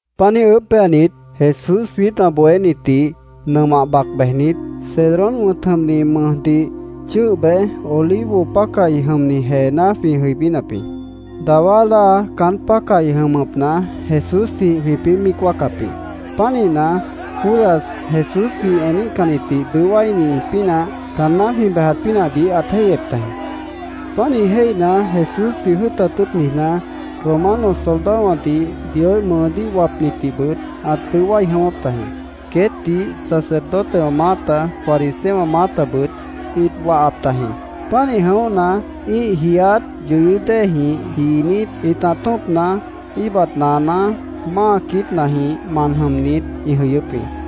Páant niíj ʉʉ́bh péanit, Jesús jwiít ã bohénitdih nʉmah bac bejnit, Cedrón wʉ̃t jʉmni mʉjdih chʉ́ʉh bej, Olivo pácahi jʉmni jeená jwĩ jʉibínap jĩ. Dawá láa caán pácahi jʉmʉpna Jesúsjĩh jwĩpĩ́ míic wáacap jĩ. Pánihna, Judas Jesúsdih eníhcannitdih dʉó wáini pínah caanná jwĩ bejat pínahdih ãt jéihyep tajĩ. Pánih jéihna, Jesúsdih jʉ́ʉtat tʉ́ʉt niijná, Romano soldadowãdih, Dioíh mʉʉdíh wapnitdihbʉt ãt dʉó wái jʉ̃ʉ́wʉ́p tajĩ. Queétdih sacerdotewã maáta, fariseowã maátabʉt ĩt wahap tajĩ. Pánih jʉ̃óhna, ĩ́ih jiiát yʉyʉ́ déejĩh jiinít, ĩtah tṍopna, íibat naaná, máa quiítnajĩh man jʉmnit, ĩ jʉyʉ́p jĩ.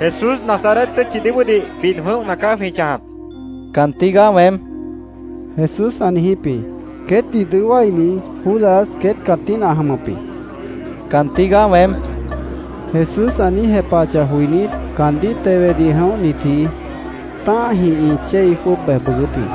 —Jesús Nazaret tʉ́tchidih bóodih bid jʉ̃óhna caá jwĩ chãjap, queét ĩ niíj jepahap jĩ. —Caan tígaá weém, Jesús ã niijíp jĩ. Queétdih dʉó wáini, Judas, queét cãtína ã jʉmʉp jĩ. “Caan tígaá weém”, Jesús ã niíj jepahachah joinít, caandíh tewedih jʉ̃óhnitji tã́ahjĩh ĩ chéi jwʉ́ʉb bej bʉʉgʉ́p jĩ.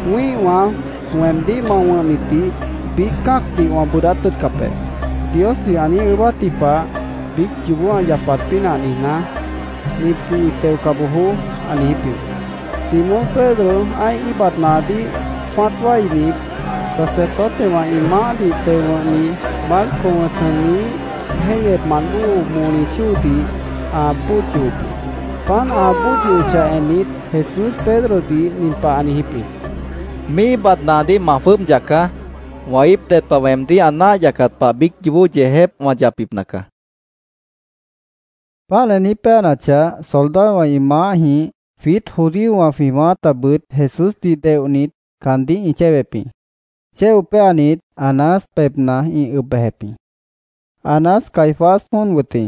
“Míihwã weemdíh ma wʉ̃hnitdih biíc cã́acdih wã bʉʉdát tʉ́ʉtcap be”, Diosdih ã niíj ʉʉ́bátji pah biíc yoobó ã yapat pínah niijná, “Nitdih ñi teoca bojoó”, ã niijíp jĩ. Simón Pedro ã́ih íibat naadíh jwã́at wáinit, sacerdotewã ĩ maáhdih teo wʉ̃hni Malco wʉ̃t jʉmniíh jéihyepmant bóo moli chóodih ã bóod yohop jĩ. Páant ã bóod yohochah ennit, Jesús Pedrodih nin pah ã niijíp jĩ: —Míih íibat naadíh ma jwʉ́ʉb yacaá. Wã íip ded pah weemdíh ã náah yacat pah biíc yoobó yeejép wã yapbipna caá, ã niijíp jĩ. Páant ã niíj péanachah, soldadowã, ĩ maáhjĩh, jwiít judíowã jwĩ maátabʉt Jesúsdih teonit, caandíh ĩ chéwep jĩ. Chéo péanit, Anás pebhna ĩ ʉb bejep jĩ. Anás Caifás jóon wʉt jĩ.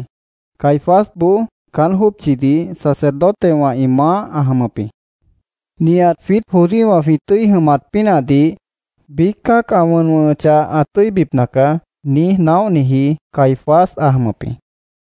Caifásboó caán jópchidih sacerdotewã ĩ maáh ã jʉmʉp jĩ. “Nihat jwiít judíowã jwĩ tʉ́i jʉmat pínahdih biíc cã́ac ã wʉn wʉ̃hʉchah ã tʉ́ibipna caá”, niíj naóhniji Caifás ã jʉmʉp jĩ.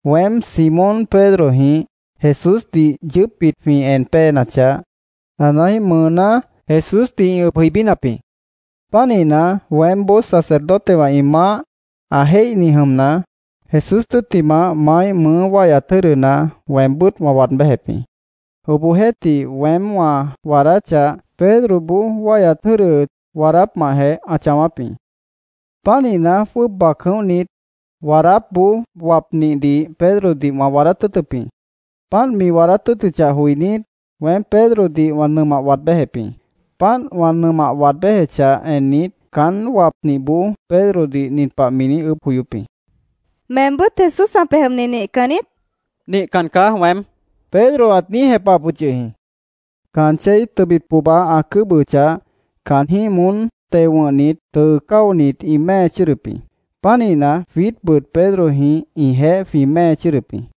Weém, Simón Pedrojĩh Jesúsdih yʉʉ́pbit jwĩ en péenachah, Anáíh mʉʉná Jesúsdih ĩ ʉb jʉibínap jĩ. Pánihna, weémboó sacerdotewã ĩ maáh ã jéihni jʉmna, Jesús tʉ́ttimah maáíh mʉʉ́ wáihyat jʉ́dʉna weembʉ́t wã waad béjep jĩ. Obohjeéhtih, weém wã waadáchah, Pedroboó wáihyat jʉ́dʉ waadápmahjeh ã chãwáp jĩ. Pánihna, jwʉ́ʉb bac jʉ̃óhnit, waadátboó wapnihdih Pedrodih wã waadát tʉ́ʉtʉp jĩ. Páant mi waadát tʉ́ʉtʉchah joinít, weém Pedrodih wã nʉmah waad béjep jĩ. Páant wã nʉmah waad béjechah ennit, caánt wapnihboó Pedrodih nin pah mi niíj ʉʉ́bh joyóp jĩ: —¿Meembʉ́t Jesús ã pej jʉmni nihcan niít? mi niijíp jĩ. —Nihcan caá weém, Pedro ã niíj jepahap yʉh jĩ. Caan chéi tʉbit pohba ã cʉ́bʉhʉchah, caanjĩ́h moón teo wʉ̃hnit tʉʉ cáonit, ĩ mée chʉ́ʉdʉp jĩ. Pánihna, jwiítbʉt Pedrojĩh ĩjeéh jwĩ mée chʉ́ʉdʉp jĩ.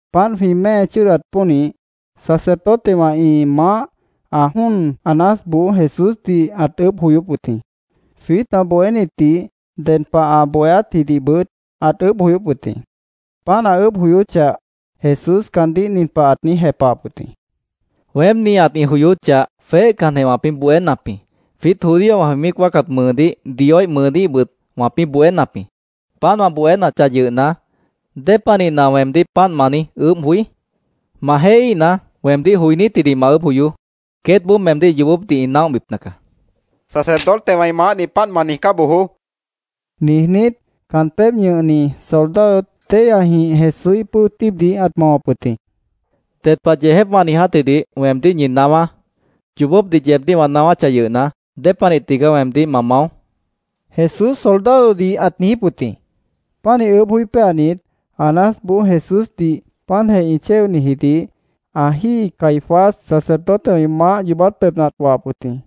Páant jwĩ mée chʉ́ʉdat pónih, sacerdotewã ĩ maáh ã jóon Anásboó Jesúsdih ãt ʉʉ́bh joyóp wʉt jĩ. Jwiít ã bohénitdih, ded pah ã bohéátjidihbʉt ãt ʉʉ́bh joyóp wʉt jĩ. Páant ã ʉʉ́bh joyóchah, Jesús caandíh nin pah ãt niíj jepahap wʉt jĩ: —Weém nihat ĩ joyóchah, jweéhcanjeh wãpĩ́ bohénap jĩ. Jwiít judíowã jwĩ míic wáacat mʉʉdíh, Dioíh mʉʉdíhbʉt wãpĩ́ bohénap jĩ. Páant wã bohénachah yʉhna, ¿dépanihna weemdíh páant ma niíj ʉʉ́bh joí? Ma jéihíhna, weemdíh joinítjidih ma ʉʉ́bh joyoó. Queétboó meemdíh yoobópdih ĩ naóhbipna caá, ãt niijíp wʉt jĩ. —Sacerdotewã ĩ maáhdih páant ma niijcá bojoó, niijnít, caan pébh ñʉhni soldado téihyajĩh Jesúíh pʉ́o tíibdih ãt mawap wʉt jĩ. —Ded pah yeejép wã niijátjidih weemdíh ñi naáwá. ¿Yoobópdih yeebdíh wã naáwáchah yʉhna, dépanih tigaá weemdíh ma mao? Jesús soldadodih ãt niijíp wʉt jĩ. Pánih ʉʉ́bh joí péanit, Anásboó Jesúsdih páantjeh ĩ chéonijidih ã jíi Caifás, sacerdotewã ĩ maáh yoobát pebhna ãt wahap wʉt jĩ.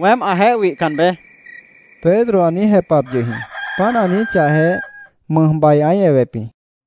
—Weém ãjeéh wihcan beé, Pedro ã niíj jepahap yʉh jĩ. Páant ã niijíchahjeh, mʉjbai ãí ewep jĩ.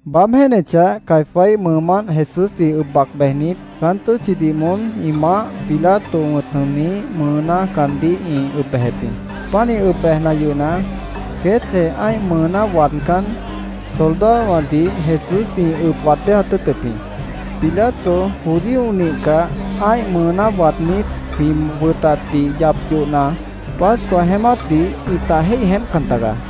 Baáb jéenechah, Caifáíh mʉʉmánt Jesúsdih ʉb bac bejnit, caán tʉ́tchidih moón ĩ maáh Pilato wʉ̃t jʉmniíh mʉʉná caandíh ĩ ʉb bejep jĩ. Pánih ʉb bejna yʉhna, queétjeh ã́ih mʉʉná waadcán, soldadowãdih Jesúsdih ĩ ʉb waad béjat tʉ́ʉtʉp jĩ. Pilato judío nihcah, ã́ih mʉʉná waadnít, jwĩ wʉtatdih yap yohna, Pascua jeémátdih ĩta jéih jeémpcan tagaá.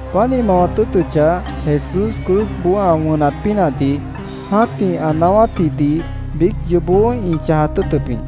Páant ĩ mawat tʉ́ʉtʉchah, Jesús cruzboó ã wʉnat pínahdih, jã́tih ã naáwátji biíc yoobó ĩ chãjat tʉ́ʉtʉp jĩ.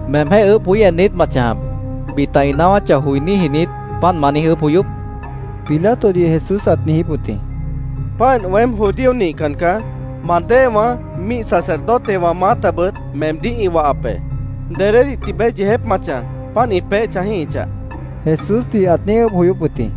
—¿Meemjéh ʉʉ́bh joí en niít ma chãjap? ¿Bita ĩ naáwáchah joiníji niít, páant ma niíj ʉʉ́bh joyóp? Pilatodih Jesús ãt niijíp wʉt jĩ. —Páant, weém judío nihcan caá. Ma déewã, ñíih sacerdotewã maátabʉt meemdíh ĩ wahap be. ¿Dedédih tibeé yeejép ma chãj, páant ĩ peéh chãjíhichah? Jesúsdih ãt niíj ʉʉ́bh joyóp wʉt jĩ.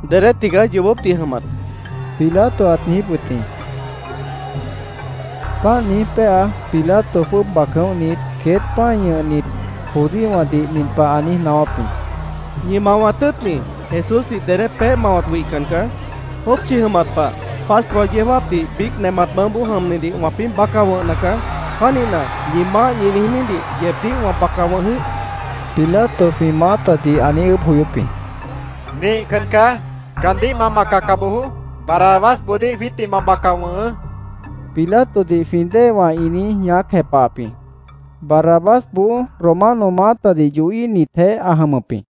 —¿Dedé tigaá yoobópdih jʉmat? Pilato ãt niijíp wʉt jĩ. Páant niíj péa, Pilato jwʉ́ʉb bac jʉ̃óhnit, queét pã́i ñʉhnit judíowãdih nin pah ã niíj naáwáp jĩ: —Ñi mawat tʉ́ʉtni Jesúsdih dedé peéh mawat wihcan caá. Jópchi jʉmat pah, Pascua yeó jáapdih biíc nemat mʉʉ́boó jʉmnidih wãpĩ́ baca wʉ̃hna caá. Pánihna, ¿ñi maáh ñi niijnídih yeebdíh wã baca wʉ̃h jĩíh? Pilato jwĩ maátadih ã niíj ʉʉ́bh joyóp jĩ. —Nihcan caá. Caandíh ma bacaca bojoó. Barrabásboodíh jwiítdih ma baca wʉ̃hʉʉ́, Pilatodih jwĩ déewã ĩ niíj ñaác jepahap jĩ. Barrabásboó Romano maátadih yohíhnitjeéh ã jʉmʉp jĩ.